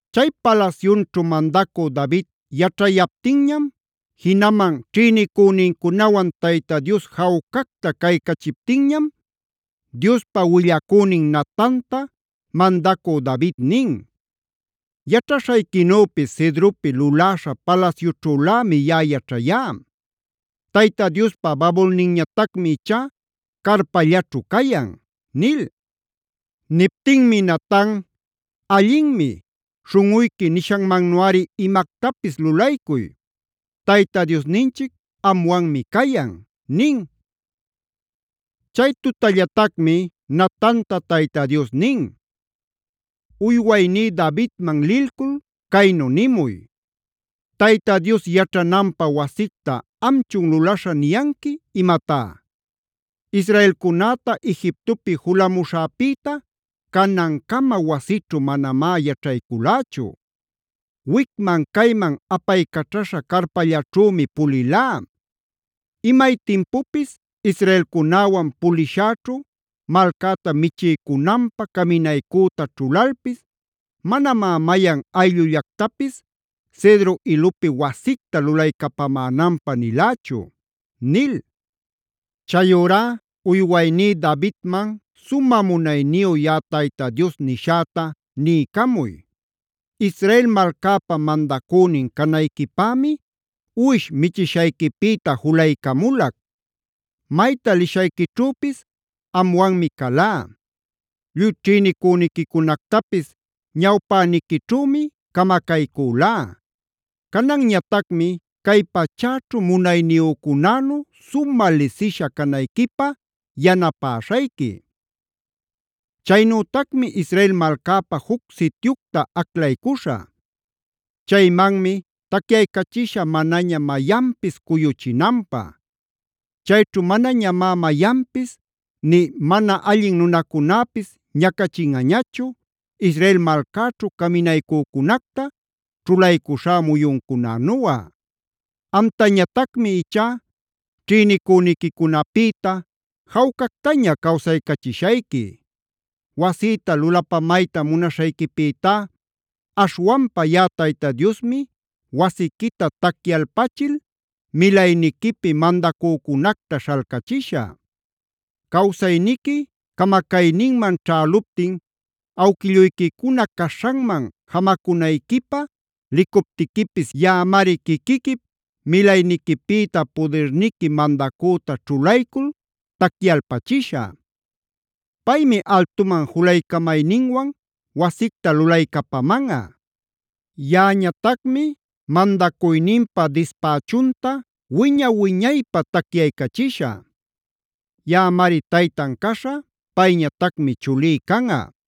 Chay palasyunćhu mandacü David yaćhayaptinñam, jinaman ćhïnicünincunawan Tayta Dios jawcacta caycachiptinñam, Diospa willacünin Natanta mandacü David nin: “Yaćhaśhayquinüpis cedropi luläśha palasyućhülämi yaꞌa yaćhayá; Tayta Diospa babulninñatacmi ichá carpallaćhu cayan” nil. Niptinmi Natan: “Allinmi, śhunꞌuyqui nishanmannuꞌari imactapis lulaycuy. Tayta Diosninchic anwanmi cayan” nin. Chay tutallatacmi Natanta Tayta Dios nin: “Uywayní Davidman lilcul caynu nimuy: ‘¿Tayta Dios yaćhananpä wasicta amchun lulaśha niyanqui imatá? Israelcunäta Egiptopi julamuśhäpïta canancama wasićhu manamá yaćhayculächu; wicman cayman apaycaćhaśha carpallaćhümi pulilá. Imay timpupis israelcunäwan pulishäćhu malcäta michiycunanpä caminaycüta ćhulalpis manamá mayan ayllullactapis cedro ilupi wasicta lulaycapamänanpä nilächu’ nil. Chayurá uywayní Davidman sumä munayniyu yaꞌa Tayta Dios nishäta niycamuy: ‘Israel malcäpa mandacünin canayquipämi uwish michishayquipïta julaycamulac. Mayta lishayquićhüpis anwanmi calá; lluy ćhïnicüniquicunactapis ñawpäniquićhümi camacaycülá. Cananñatacmi cay pachäćhu munayniyücunänu sumä lisisha canayquipä yanapäśhayqui. Chaynütacmi Israel malcäpä juc sityucta aclaycuśhä. Chaymanmi taycaycachishä manaña mayanpis cuyuchinanpä. Chayćhu manañamá mayanpis nï mana allin nunacunäpis ñacachinꞌañachu, Israel malcäćhu caminaycücunacta ćhulaycuśhá muyuncunänuꞌa. Amtañatacmi ichá ćhïnicüniquicunapïta jawcactaña cawsaycachishayqui. Wasïta lulapamayta munaśhayquipïtá aśhwanpa yaꞌa Tayta Diosmi wasiquita tacyalpachil milayniquipi mandacücunacta śhalcachishä. Cawsayniqui camacayninman ćhäluptin awquilluyquicuna caśhanman jamacunayquipä licuptiquipis yaꞌamari quiquiquip milayniquipïta pudirniqui mandacüta ćhulaycul tacyalpachishä. Paymi altuman julaycamayninwan wasicta lulaycapamanꞌa. Yaꞌañatacmi mandacuyninpa dispächunta wiña-wiñaypä tacyaycachishä. Yaꞌamari taytan caśhä; payñatacmi chulí canꞌa.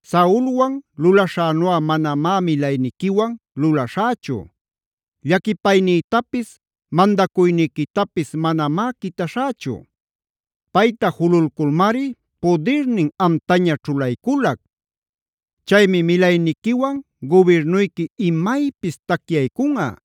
Saulwan lulaśhänuꞌa manamá milayniquiwan lulaśhächu: llaquipaynïtapis mandacuyniquitapis manamá quitaśhächu. Payta jululculmari pudirnin amtaña ćhulayculac. Chaymi milayniquiwan gubirnuyqui imaypis tacyaycunꞌa;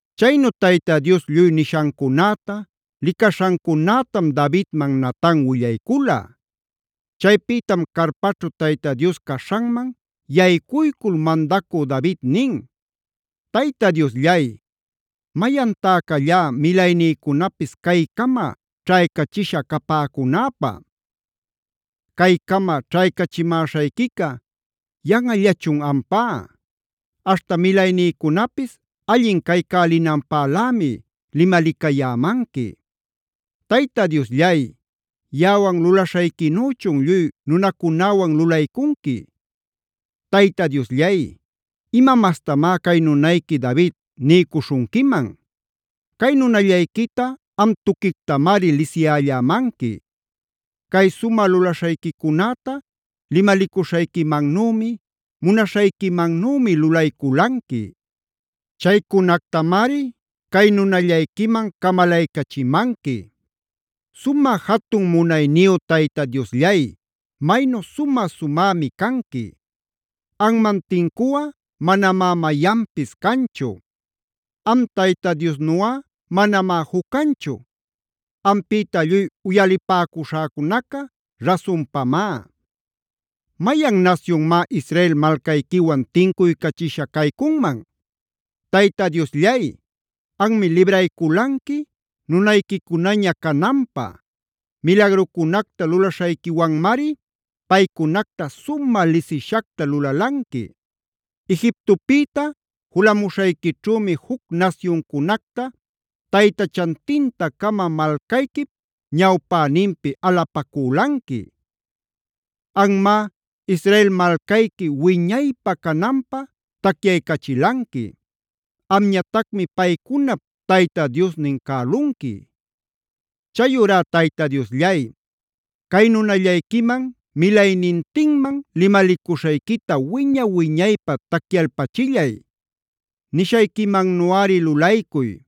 Chaynu Tayta Dios lluy nishancunäta, licaśhancunätam Davidman Natan willaycula. Chaypïtam carpäćhu Tayta Dios caśhanman yaycuycul mandacü David nin: “Tayta Diosllay, ¿mayantá callá milaynïcunapis caycama ćhaycachisha capäcunäpä? Caycama ćhaycachimäśhayquica yanꞌallachun ampá; aśhta milaynïcunapis allin caycälinanpälämi limalicayämanqui. Tayta Diosllay, ¿yaꞌawan lulaśhayquinüchun lluy nunacunäwan lulaycunqui? Tayta Diosllay, ¿ima mastamá cay nunayqui David niycuśhunquiman? Cay nunallayquita am tuquictamari lisiyällämanqui. Cay sumä lulaśhayquicunäta limalicuśhayquimannümi, munaśhayquimannümi lulayculanqui. Chaycunactamari cay nunallayquiman camalaycachimanqui. ¡Sumä jatun munayniyu Tayta Diosllay maynu sumä-sumämi canqui! Anman tincuꞌa manamá mayanpis canchu. Am Tayta Diosnuꞌa manamá juc canchu; ampïta lluy uyalipäcuśhäcunaca rasunpamá. ¿Mayan nasyunmá Israel malcayquiwan tincuycachisha caycunman? Tayta Diosllay, anmi librayculanqui nunayquicunaña cananpä. Milagrucunacta lulaśhayquiwanmari paycunacta sumä lisishacta lulalanqui. Egiptopïta julamuśhayquićhümi juc nasyuncunacta taytachantinta-cama malcayquip ñawpäninpi alapacülanqui. Anmá Israel malcayqui wiñaypä cananpä tacyaycachilanqui; amñatacmi paycunap Tayta Diosnin cälunqui. “Chayurá Tayta Diosllay, cay nunallayquiman milaynintinman limalicuśhayquita wiña-wiñaypä tacyalpachillay. Nishayquimannuꞌari lulaycuy.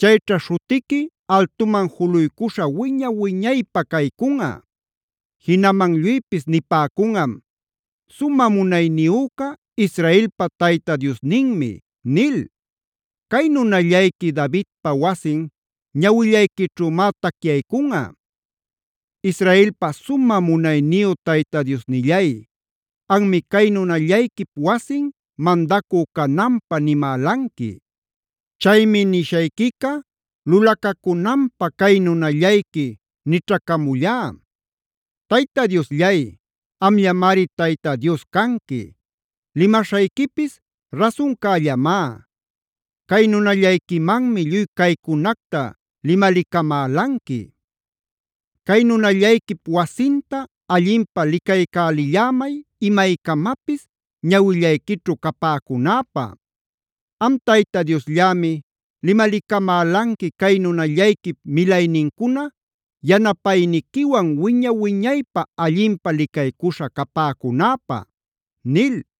Chayćha śhutiqui altuman juluycuśhä wiña-wiñaypä caycunꞌa. Jinaman lluypis nipäcunꞌam: ‘¡Sumä munayniyüca Israelpa Tayta Diosninmi!’ nil. Cay nunallayqui Davidpa wasin ñawillayquićhümá tacyaycunꞌa. Israelpa sumä munayniyu Tayta Diosnillay, anmi cay nunallayquip wasin mandacü cananpä nimälanqui. Chaymi nishayquica lulacacunanpä cay nunallayqui nićhacamullá. Tayta Diosllay, amllamari Tayta Dios canqui; limaśhayquipis rasuncällamá. Cay nunallayquimanmi lluy caycunacta limalicamälanqui. Cay nunallayquip wasinta allinpä licaycälillämay imaycamapis ñawillayquićhu capäcunäpa. Am Tayta Diosllämi limalicamälanqui cay nunallayquip milaynincuna yanapayniquiwan wiña-wiñaypä allinpä licaycuśha capäcunäpä” nil.